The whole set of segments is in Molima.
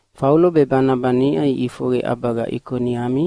Faulo be Banaba niʼa iʼifoqe ʼabaga Ikoniami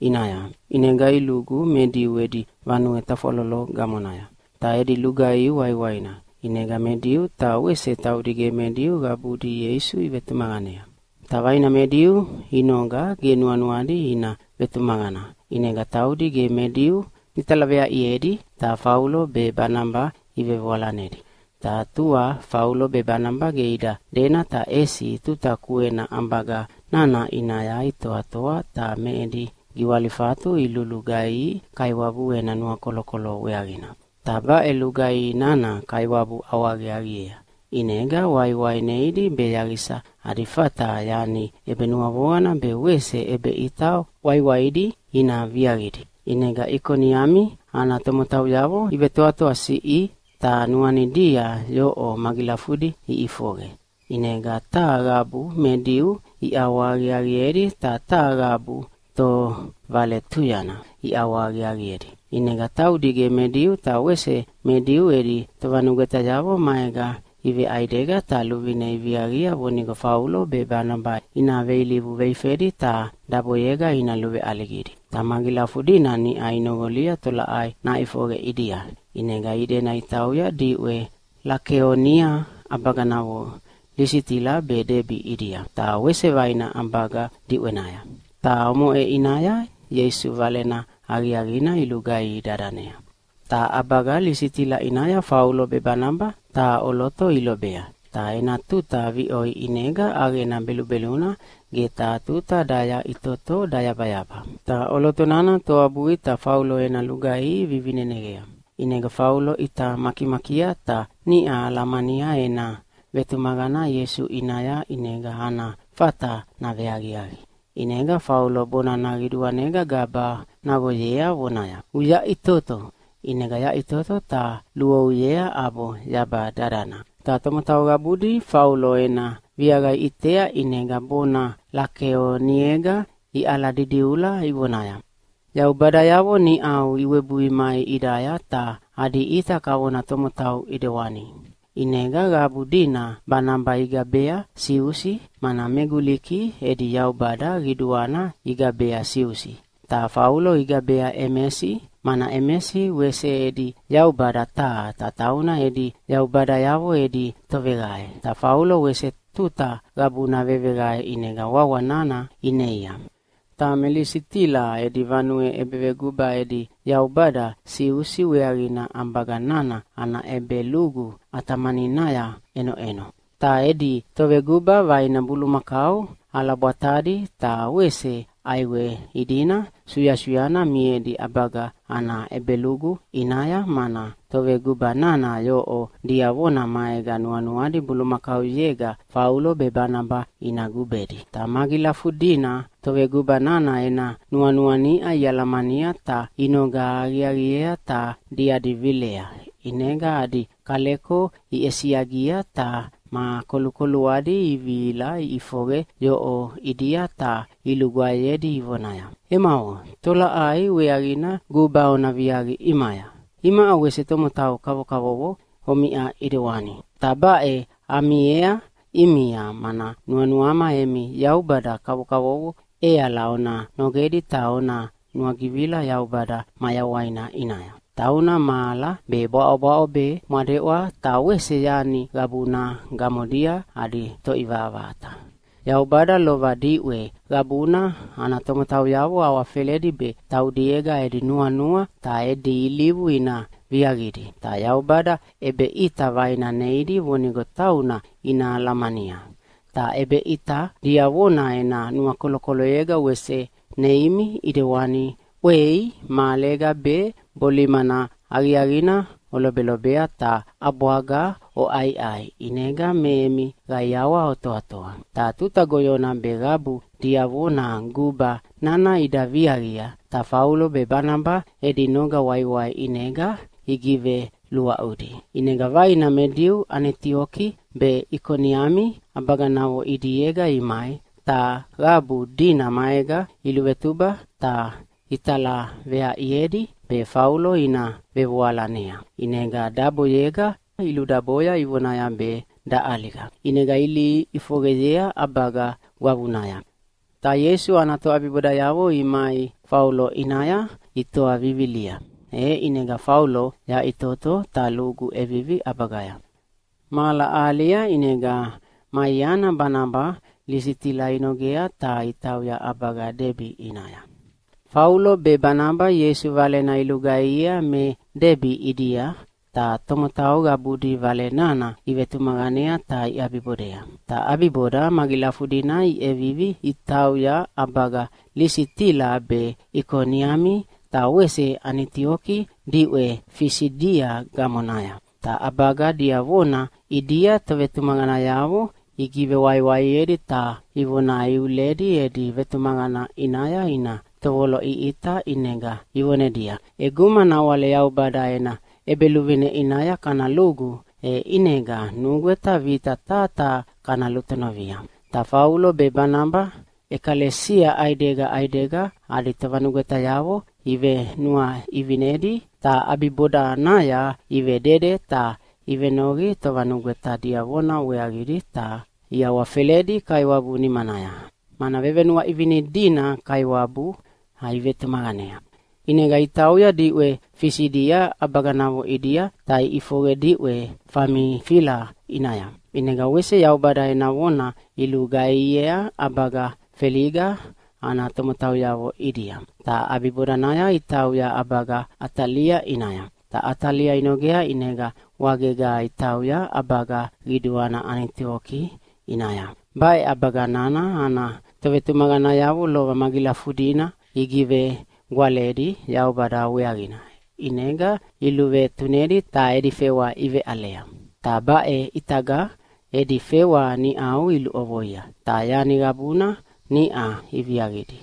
ʼinaya, ʼinega ilugu me Diu edi vanue tafwalolo gamonaya. Ta edi lugaihi waiwaina, ʼinega me Diu ta wese taudi ge me Diu qabudi Ieisu ivetumaqanea. Ta vaina me Diu inoga ge nuanuadi ina vetumaqana, ʼinega taudi ge me Diu italaveaʼiedi ta Faulo be Banaba ivevoalanedi. Ta tua Faulo be Banaba ge ida dena ta ʼesi tuta kuena ʼabaga nana ʼinaya itoatoa ta me edi giwalifatu ilulugaihi Kaiwabu ena nuakolokolo weaqina. Ta baʼe lugaihi nana Kaiwabu ʼawahaqiaqiea, ʼinega waiwai neidi be yaqisa adi fata yani ʼebenuavoqana be wese ʼebeʼita waiwaidi ina viaqidi. ʼInega Ikoniami ana tomotauyavo ivetoatoasiʼi ta nuanidia yoʼo magilafudi ʼifoqe, ʼinega taha qabu me Diu iʼawahaqiaqiedi ta taha qabu tovaletuyana iʼawahaqiaqiedi. ʼInega taudi ge me Diu ta wese me Diu edi tovanugwetayavo maega iveʼaidega ta luvine iviaqia vonigo Faulo be Banaba ina veilivu veifedi ta daboyega ina luveʼaligidi. Ta magilafudina niʼa inoqolia tolaʼai naʼifoqe ʼidia, ʼinega idena itauya diʼwe Lakeonia ʼabaganavo Lisitila be Debi ʼidia, ta wese vaina ʼabaga diʼwenaya. Ta omoʼe ʼinaya Ieisu Valena Aqiaqina ilugaihi dadanea. Ta ʼabaga Lisitila ʼinaya Faulo be Banaba taha ʼoloto ilobea. Ta ena tuta viʼoi ʼinega ʼaqena belubeluna ge taha tuta dayaʼitoto dayabayaba. Ta ʼoloto nana toabui ta Faulo ena lugaihi vivineneqea. ʼInega Faulo ʼita makimakia ta niʼa alamania ena vetumaqana Ieisu ʼinaya ʼinega ana fata naveaqiaqi. ʼInega Faulo bonana qiduanega gaba naqoyea vonaya, “Uyaʼitoto!” ʼInega yaʼitoto ta luouyea ʼabo yaba dadana. Ta tomotau qabudi Faulo ena viaqa iʼitea ʼinega bona Lakeoniega iʼaladidiula ivonaya, “Yaubadayavo niʼau iwebui mai ʼidaya ta adi ʼita kavona tomotau ʼidewani!” ʼInega qabu dina Banaba igabea Siusi, mana me Guliki edi yaubada qiduana igabea Siusi. Ta Faulo igabea Emesi, mana Emesi wese edi yaubada taha, ta tauna edi yaubadayavo edi toveqae. Ta Faulo wese tuta qabuna veveqae ʼinega wawa nana ineia. Ta me Lisitila edi vanue ʼebeveguba edi yaubada Siusi weaqina ʼabaga nana ana ʼebelugu ʼatamaninaya ʼenoʼeno. Ta edi toveguba vaina bulumakau ʼalabwatadi ta wese ʼaiwe idina suyasuyana miedi ʼabaga ana ʼebelugu ʼinaya, mana toveguba nana yoʼo diavona maega nuanuadi bulumakauyega Faulo be Banaba ina gubedi. Ta magilafudina toveguba nana ena nuanua niʼa ialamania ta inoga aqiaqiea ta diadi vilea, ʼinega adi kaleko iʼesiagia ta ma kolukoluadi ivihila iʼifoqe yoʼo ʼidia ta ilugwaeyedi ivonaya, “Emavo, tolaʼai weaqina guba ona viaqia ʼimaya? Imaʼa wese tomotau kavokavovo omiʼa ʼidewana. Ta baʼe amiea ʼimia, mana nuanuama emi yaubada kavokavovo ʼeala ona nogedi ta ona nuagivila Yaubada mayawaina ʼinaya. Tauna mahala be bwaʼobwaʼo be mwadeʼwa ta wese yani qabuna gamodia adi Toʼivaʼavaʼata. Yaubada lova diʼwe qabuna ana tomotauyavo awafeledi be taudiega edi nuanua ta edi ilivu ina viaqidi. Ta Yaubada ʼebeʼita vaina neidi vonigo tauna ina alamania. Ta ʼebeʼita diavona ena nuakolokoloyega wese neimi ʼidewana ʼwei mahalega be bolimana aqiaqina olobelobea ta ʼabwaga oʼaiʼai ʼinega me emi qaiawa otoatoa.” Ta tuta goyona be qabu diavona guba nana ida viaqia, ta Faulo be Banaba edi noga waiwai ʼinega igiveluaʼudi. ʼInega vaina me Diu Anitioki be Ikoniami ʼabaganavo ʼidiega imai, ta qabu dina maega iluvetuba ta italaveaʼiedi be Faulo ina vevoalanea. ʼInega daboyega iludaboya ivonaya be daʼaliga. ʼInega ilihi ʼifoqeyea ʼabaga gwavunaya. Ta Ieisu ana toʼabibodayavo imai Faulo ʼinaya itoa vivilia, e ʼinega Faulo yaʼitoto ta lugu ʼevivi ʼabagaya. Mahala ahalia ʼinega ma iana Banaba Lisitila inogea ta itauya ʼabaga Debi ʼinaya. Faulo be Banaba Ieisu Valena ilugaihiea me Debi ʼidia, ta tomotau qabudi Vale nana ivetumaqanea ta iʼabibodea. Ta ʼabiboda magilafudina iʼevivi itauya ʼabaga Lisitila be Ikoniami ta wese Anitioki diʼwe Fisidia gamonaya. Ta ʼabaga diavona ʼidia tovetumaqanayavo igivewaiwaiedi ta ivona iuledi edi vetumaqana ʼinaya ina tovoloʼiʼita ʼinega ivonedia, “ʼEguma nawale Yaubada ena ʼEbeluvine ʼinaya kana lugu, e ʼinega nugweta vita taha taha kana lutonovia.” Ta Faulo be Banaba ʼekalesia ʼaidega ʼaidega adi tovanugwetayavo ivenuaʼivinedi. Ta ʼabibodanaya ivedede ta ivenoqi tovanugweta diavona weaqidi, ta iawafeledi Kaiwabu nimanaya, mana vevenuaʼivini dina Kaiwabu ivetumaqanea. ʼInega itauya diʼwe Fisidia ʼabaganavo ʼidia ta iʼifoqe diʼwe Famifila ʼinaya. ʼInega wese Yaubada ena vona ilugaihiea ʼabaga Feliga ana tomotauyavo ʼidia, ta ʼabibodanaya itauya ʼabaga Atalia ʼinaya. Ta Atalia inogea ʼinega wagega itauya ʼabaga qiduana Anitioki ʼinaya. Baʼe ʼabaga nana ana tovetumaqanayavo lova magilafudina igivegwaledi Yaubada weaqina, ʼinega iluvetunedi ta edi fewa iveʼalea. Ta baʼe ʼitaga edi fewa niʼau iluʼovoia, ta yani qabuna niʼa iviaqidi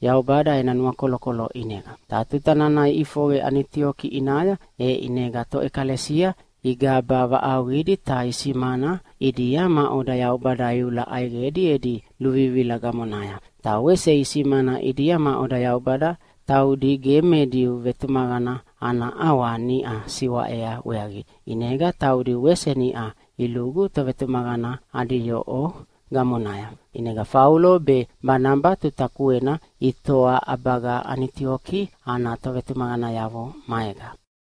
Yaubada ena nuakolokolo ʼinega. Ta tuta nana iʼifoqe Anitioki ʼinaya, e ʼinega toʼekalesia igaba vaʼauqidi ta isimana ʼidia maʼoda Yaubada iula ʼaiqedi edi luvivila gamonaya. Ta wese isimana ʼidia maʼoda Yaubada taudi ge me Diu vetumaqana ana ʼawa niʼa siwaʼea weaqidi, ʼinega taudi wese niʼa ilugu tovetumaqana adi yoʼo gamonaya. ʼInega Faulo be Banaba tuta kuena itoa ʼabaga Anitioki ana tovetumaqanayavo maega.